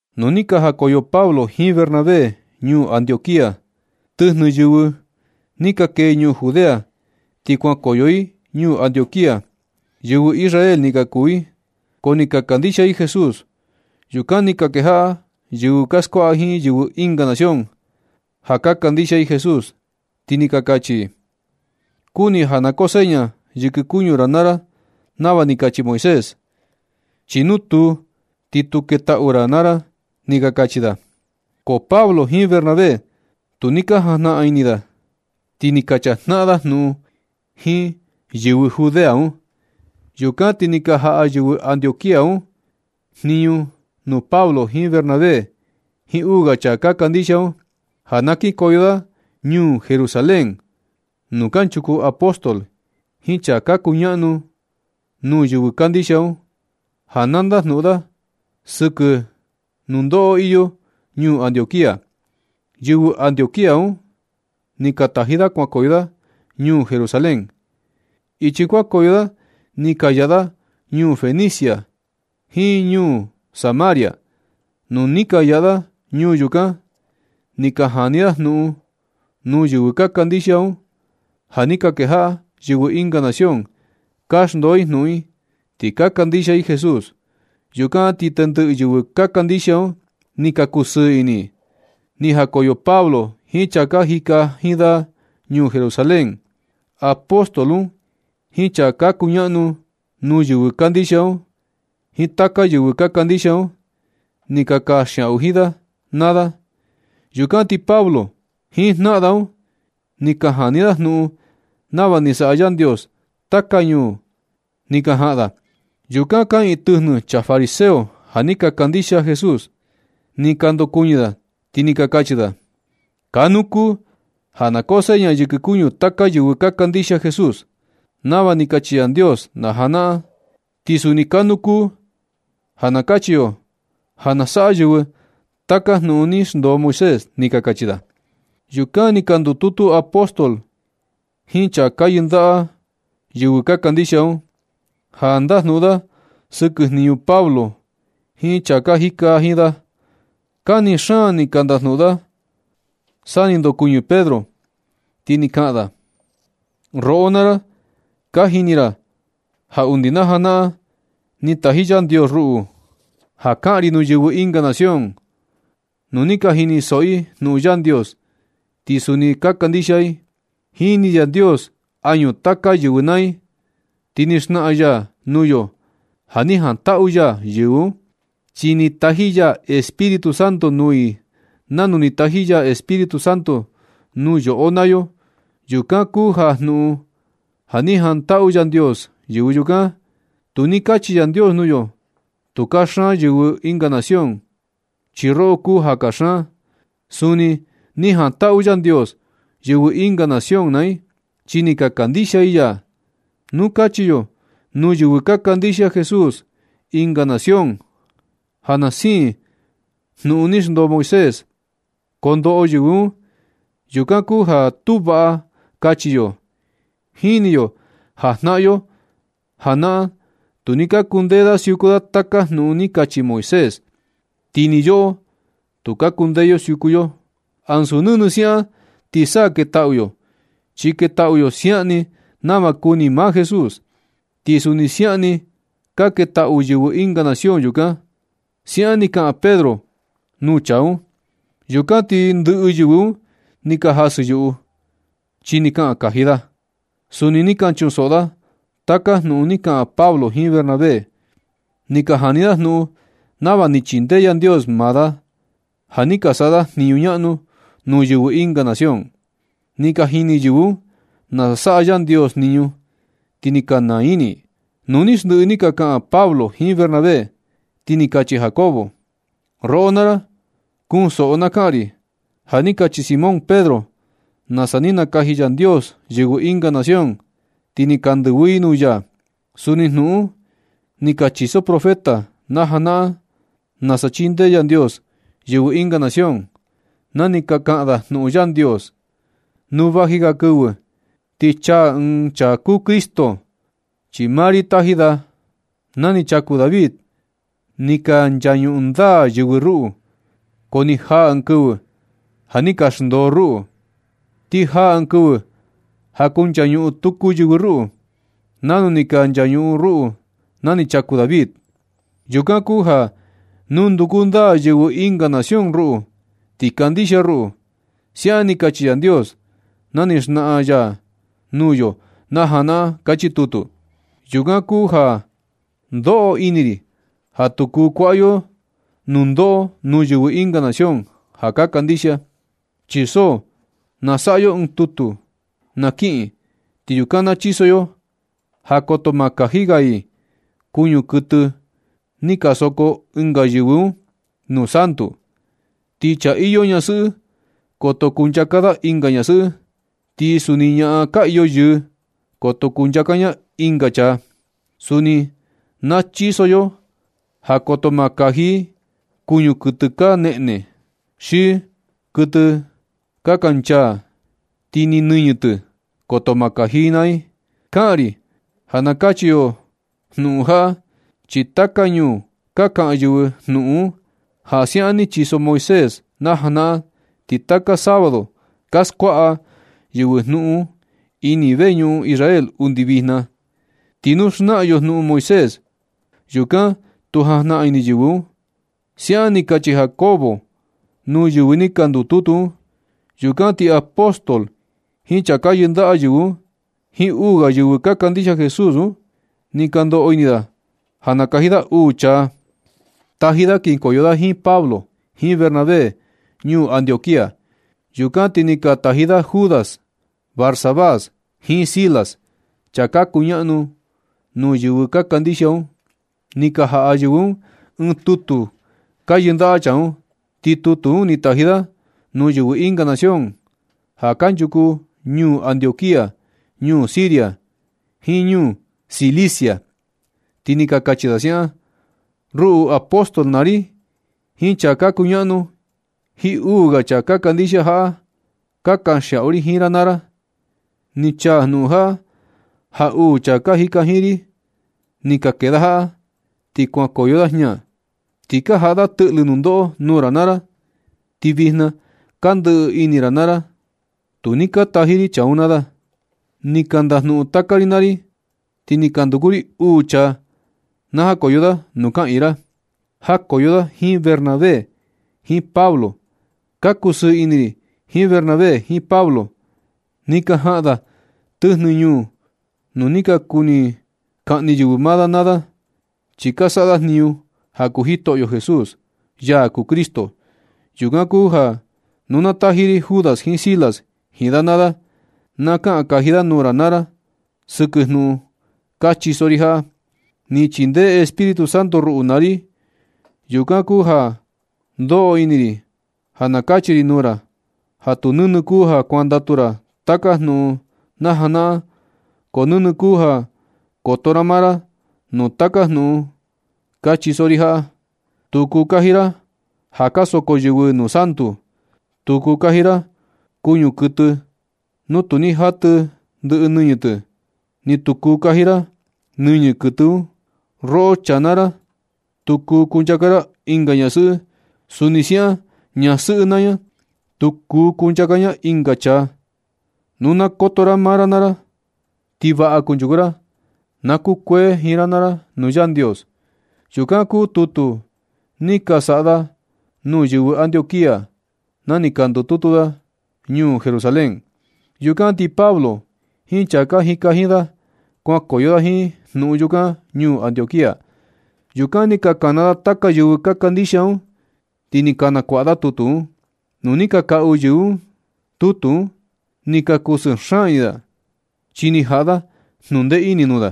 Nu ni ka najakoyo Pablo jiin Bernabé ñuu Antioquía tɨjnɨ yɨvɨ ni ka kee ñuu Judea, ti kuankoyo i ñuu Antioquía. Yɨvɨ Israel ni ka kuu i, ko ni ka kandixia i Jesús. Yukan ni ka kejaꞌa yɨvɨ ka skuaꞌa jiin yɨvɨ ɨnga nación ja ka kandixia i Jesús, ti ni ka kachi i: ―Kuni ja na koo seña yɨkɨ kuñu ra naa ra nava ni kachi Moisés, chi nu tuu, ti tu ketaꞌu ra naa ra ―ni ka kachi da. Ko Pablo jiin Bernabé tu ni ka jajnaꞌan ini da, ti ni ka chajnaꞌan da jnuꞌun jiin yɨvɨ Judea un. Yukan ti ni ka jaꞌa yɨvɨ Antioquía un jniñu nuu Pablo jiin Bernabé jiin uu ga chaa ka kandixia un, ja na kinkoyo da ñuu Jerusalén nuu kanchuku apóstol jiin chaa ka kuñaꞌnu nuu yɨvɨ kandixia un, ja na ndajnuꞌun da sɨkɨ nundoꞌo iyo ñuu Antioquía. Yɨvɨ Antioquía un ni ka taji da kuankoyo da ñuu Jerusalén. Ichi kuankoyo da ni ka yaꞌa da ñuu Fenicia jiin ñuu Samaria. Nu ni ka yaꞌa da ñuu yukan, ni ka jani da jnuꞌun nuu yɨvɨ ka kandixia un, ja ni ka kejaꞌa yɨvɨ ɨnga nación ka xndoo i jnuún i ti ka kandixia i Jesús. Yukan ti tendɨꞌɨ yɨvɨ ka kandixia un ni ka kusɨɨ ini i. Ni jakoyo Pablo jiin chaa ka jika jiin da ñuu Jerusalén, apóstol un jiin chaa ka kuñaꞌnu nuu yɨvɨ kandixia un, jiin taka yɨvɨ ka kandixia un, ni ka kanxiaꞌu jiin da naa da. Yukan ti Pablo jiin jnaꞌan da un ni ka jani da jnuꞌun nava ni saꞌa Yandios taka ñuu ni ka jaꞌan da. Yukan kaꞌiin tɨjnɨ chaa fariseo ja ni ka kandixia Jesús. Ni ka ndokuɨñɨ da, ti ni ka kachi da: ―Kanu kuu ja na koo seña yɨkɨ kuñu taka yɨvɨ ka kandixia Jesús, nava ni kachi Yandios najanaꞌan, ti suni kanu kuu ja na kachi yo ja na saꞌa yɨvɨ taka jnuꞌun ni xndoo Moisés ―ni ka kachi da. Yukan ja ni ka ndututu apóstol jiin chaa ka yɨndaꞌa yɨvɨ ka kandixia un, ja ndajnuꞌun da sɨkɨ jniñu Pablo jiin chaa ka jika jiin da. Kani xaan ni ka ndajnuꞌun da sa ni ndokuɨñɨ Pedro, ti ni kaꞌan da: ―Roꞌo naa ra, ja ka jini ra ja undi najanaꞌan ni taji Yandios ruꞌu ja kaꞌan ri nuu yɨvɨ ɨnga nación. Nu ni ka jinisoꞌo i jnuꞌun Yandios, ti suni ni ka kandixia i. Jini Yandios añu taka yɨvɨ naa i, ti ni xnaꞌan ya nuu yo ja ni jantaꞌu ya yɨvɨ un, chi ni taji ya Espíritu Santo nuu i nanu ni taji ya Espíritu Santo nuu yoꞌo naa yo. Yukan kuu jnuꞌun ja ni jantaꞌu Yandios yɨvɨ yukan. Tu ni kachi Yandios nuu yo: “Tu kaxan yɨvɨ ɨnga nación, chi roꞌo kuu ja kaxan.” Suni ni jantaꞌu Yandios yɨvɨ ɨnga nación naa i, chi ni ka kandixia i ya. Nu kachi yo nuu yɨvɨ ka kandixia Jesús ɨnga nación ja na siin jnuꞌun ni xndoo Moisés, kondoꞌo yɨvɨ un. Yukan kuu ja tu vaꞌa kachi yo. Jini yo ja jnaꞌan yo janaꞌan, tu ni ka kundee da siuku da taka jnuꞌun ni kachi Moisés. Ti ni yoꞌo, tu ka kundee yo siuku yo. Ansu nɨnɨ siaꞌan ti sa ketaꞌu yo, chi ketaꞌu yo siaꞌan ni nava kuni maa Jesús. Ti suni siaꞌan ni ka ketaꞌu yɨvɨ ɨnga nación yukan ―siaꞌan ni kaꞌan Pedro nuu chaa un. Yukan ti ni ndɨꞌɨ yɨvɨ un ni ka jasɨ yuꞌu, chi ni kaꞌan kaji da. Suni ni ka chunsoꞌo da taka jnuꞌun ni ka kaꞌan Pablo jiin Bernabé. Ni ka jani da jnuꞌun nava ni chindee Yandios maa da, ja ni ka saꞌa da jniñu ñaꞌnu nuu yɨvɨ ɨnga nación. Ni ka jini yɨvɨ un nasa saꞌa Yandios jniñu, ti ni ka naa ini i. Nu ni ndɨꞌɨ ni ka kaꞌan Pablo jiin Bernabé, ti ni kachi Jacobo: ―Roꞌo naa ra, kunsoꞌo na kaꞌan ri. Ja ni kachi Simón Pedro nasa ni nakaji Yandios yɨvɨ ɨnga nación, ti ni ka ndɨvɨ i nuu ya. Suni jnuꞌun un ni ka chiso profeta najanaꞌan nasa chindee Yandios yɨvɨ ɨnga nación na ni ka kaꞌan da jnuꞌun Yandios: Nu vaji ga kɨvɨ, ti chaa ɨɨn chaa kuu Cristo, chi maa ri taji da. Na ni chaku David ni ka nchañuꞌun ndaa yɨvɨ ruꞌu, ko ni jaa ɨɨn kɨvɨ ja ni ka xndoo ruꞌu. Ti jaa ɨɨn kɨvɨ ja kunchañuꞌun tuku yɨvɨ ruꞌu, nanu ni ka nchañuꞌun ruꞌu na ni chaku David. Yukan kuu ja na nduku ndaa yɨvɨ ɨnga nación ruꞌu, ti kandixia ruꞌu. Siaꞌan ni kachi Yandios na ni xnaꞌan ya nuu yo na janaꞌan. Kachi tutu. Yukan kuu ja ndoꞌo ini ri ja tu kuu kuaꞌa yo nundoꞌo nuu yɨvɨ ɨnga nación ja ka kandixia. Chi so ja na saꞌa yo ɨɨn tutu na kiꞌin, ti yukan na chiso yo ja koto ma kaji ga i kuñu kuɨtɨ ni ka soko ɨnga yɨvɨ un nuu santu i, ti chaa iyo ñasɨꞌɨ koto kunchaka da ɨnga ñasɨꞌɨ. Ti suni ñaꞌan ka iyo yɨɨ, koto kunchaka ña ɨnga chaa. Suni na chiso yo ja koto ma kaji i kuñu kuɨtɨ ka neꞌne, xi kuɨtɨ ka kanchaa ti ni nɨñɨ tɨ, koto ma kaji i naa i. Kaꞌan ri ja na kachi yo jnuꞌun jaꞌa, chi taka ñuu ka kaꞌan yɨvɨ jnuꞌun un ja siaꞌan ni chiso Moisés najanaꞌan, ti taka sábado ka skuaꞌa yɨvɨ jnuꞌun un ini veñuꞌun Israel undi vijna. Ti nu xnaa yo jnuꞌun Moisés, yukan tu jajnaꞌan ini yɨvɨ un ―siaꞌan ni kachi Jacobo nuu yɨvɨ ni ka ndututu un. Yukan ti apóstol jiin chaa ka yɨndaꞌa yɨvɨ un, jiin uu ga yɨvɨ ka kandixia Jesús un, ni ka ndoꞌo ini da ja nakaji da uu chaa taji da kinkoyo da jiin Pablo jiin Bernabé ñuu Antioquía. Yukan ti ni ka taji da Judas Barsabás jiin Silas, chaa ka kuñaꞌnu nuu yɨvɨ ka kandixia un. Ni ka jaꞌa yɨvɨ un ɨɨn tutu ka yɨndaꞌa chaa un. Ti tutu un ni taji da nuu yɨvɨ ɨnga nación ja kanchuku ñuu Antioquía, ñuu Siria, jiin ñuu Cilicia, ti ni ka kachi da siaꞌan: “Ruꞌu apóstol naa ri jiin chaa ka kuñaꞌnu jiin uu ga chaa ka kandixia jaꞌa. Ka kanxiaꞌu ri jiin ra naa ra. Ni chaa jnuꞌun jaꞌa ja uu chaa ka jika jiin ri ni ka kee da jaꞌa, ti kuajakoyo da jña, ti ka jaꞌa da tɨꞌlɨ nundoꞌo nuu ra naa ra, ti vijna ka ndɨꞌɨ ini ra naa ra. Tu ni ka taji ri chaa un naa da. Ni ka ndajnuꞌun taka ri naa ri, ti ni ka nduku ri uu chaa na jakoyo da nuu kaꞌiin ra. Jakoyo da jiin Bernabé jiin Pablo. Ka kusɨɨ ini ri jiin Bernabé jiin Pablo. Ni ka jaꞌan da tɨjnɨ ñuu nuu ni ka kuni kaꞌni yɨvɨ da naa da, chi ka saꞌa da jniñu ja kuu Jitoꞌyo Jesús, ya kuu Cristo. Yukan kuu ja na taji ri Judas jiin Silas jiin da naa da. Ka kaꞌan kaji da nuu ra naa ra sɨkɨ jnuꞌun ka chiso ri jaꞌa. Ni chindee Espíritu Santo ruꞌu naa ri. Yukan kuu ja ka ndoꞌo ini ri ja na kachi ri nuu ra ja tu nɨnɨ kuu ja kuandatu ra taka jnuꞌun najanaꞌan, ko nɨnɨ kuu ja koto ra maa ra nuu taka jnuꞌun ka chiso ri jaꞌa. Tu kuu kaji ra ja ka soko yɨvɨ nuu santu. Tu kuu kaji ra kuñu kuɨtɨ nu tu ni jatɨ ndɨꞌɨ nɨñɨ tɨ, ni tu kuu kaji ra nɨñɨ kuɨtɨ. Roꞌo chaa naa ra, tu kuu kunchaka ra ɨnga ñasɨꞌɨ. Suni siaꞌan ñasɨꞌɨ naa ña, tu kuu kunchaka ña ɨnga chaa. Nu na koto ra maa ra naa ra ti vaꞌa kunchuku ra. Na kukuee jiin ra naa ra nuu Yandios.” Yukan kuu tutu ni ka saꞌa da nuu yɨvɨ Antioquía na ni ka ndututu da ñuu Jerusalén. Yukan ti Pablo jiin chaa ka jika da jiin da, kuankoyo da jiin jnuꞌun yukan ñuu Antioquía. Yukan ni ka kana da taka yɨvɨ ka kandixia un, ti ni ka nakuaꞌa da tutu un. Nu ni ka kaꞌu yɨvɨ un tutu un, ni ka kusɨɨ xaan ini da, chi ni jaꞌa da jnundee ini nuu da.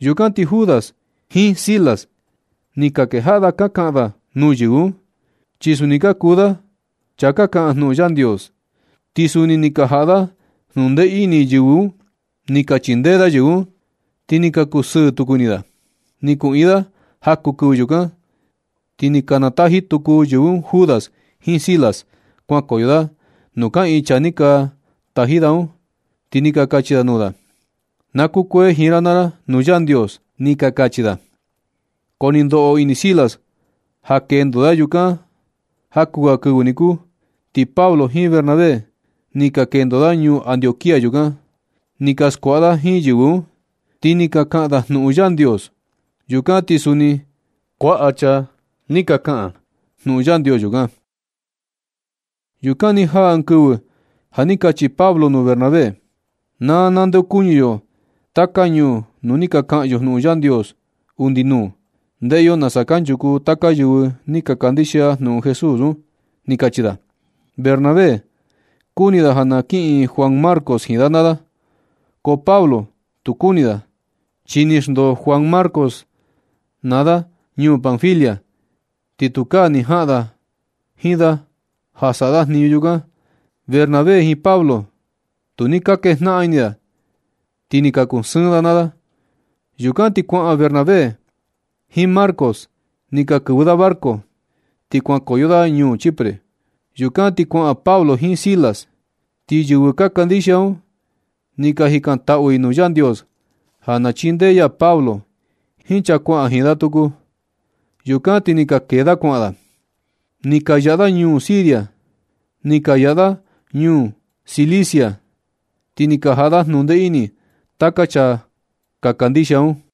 Yukan ti Judas jiin Silas ni ka kejaꞌa da ka kaꞌan da nuu yɨvɨ un, chi suni ka kuu da chaa ka kaꞌan jnuꞌun Yandios, ti suni ni ka jaꞌa da jnundee ini yɨvɨ un. Ni ka chindee da yɨvɨ un, ti ni ka kusɨɨ tuku ini da. Ni kuꞌiin da jaku kɨvɨ yukan, ti ni ka nataji tuku yɨvɨ un Judas jiin Silas kuankoyo da nuu kaꞌiin chaa ni ka taji da un. Ti ni ka kachi da nuu da: ―Na kukuee jiin ra naa ra nuu Yandios ―ni ka kachi da. Ko ni ndoꞌo ini Silas ja kendo da yukan jaku ga kɨvɨ niku. Ti Pablo jiin Bernabé ni ka kendo da ñuu Antioquía yukan. Ni ka skuaꞌa da jiin yɨvɨ un, ti ni ka kaꞌan da jnuꞌun Yandios. Yukan ti suni kuaꞌa chaa ni ka kaꞌan jnuꞌun Yandios yukan. Yukan ni jaa ɨɨn kɨvɨ ja ni kachi Pablo nuu Bernabé: ―Na nandeokuñɨ yo taka ñuu nuu ni ka kaꞌan yo jnuꞌun Yandios undi nuu. Ndeꞌe yo nasa kanchuku taka yɨvɨ ni ka kandixia jnuꞌun Jesús un ―ni kachi da. Bernabé kuni da ja na kiꞌin Juan Marcos jiin da naa da. Ko Pablo tu kuni da, chi ni xndoo Juan Marcos da naa da ñuu Panfilia, ti tukaa ni jaꞌan da jiin da ja saꞌa da jniñu yukan. Bernabé jiin Pablo tu ni ka kejnaꞌan ini da, ti ni ka kusɨɨn da naa da. Yukan ti kuaꞌan Bernabé jiin Marcos ni ka kɨvɨ da barco, ti kuankoyo da ñuu Chipre. Yukan ti kuaꞌan Pablo jiin Silas. Ti yɨvɨ ka kandixia un ni ka jikantaꞌu i nuu Yandios ja na chindee ya Pablo jiin chaa kuaꞌan jiin da tuku. Yukan ti ni ka kee da kuaꞌan da. Ni ka yaꞌa da ñuu Siria, ni ka yaꞌa da ñuu Cilicia, ti ni ka jaꞌa da jnundee ini taka chaa ka kandixia un.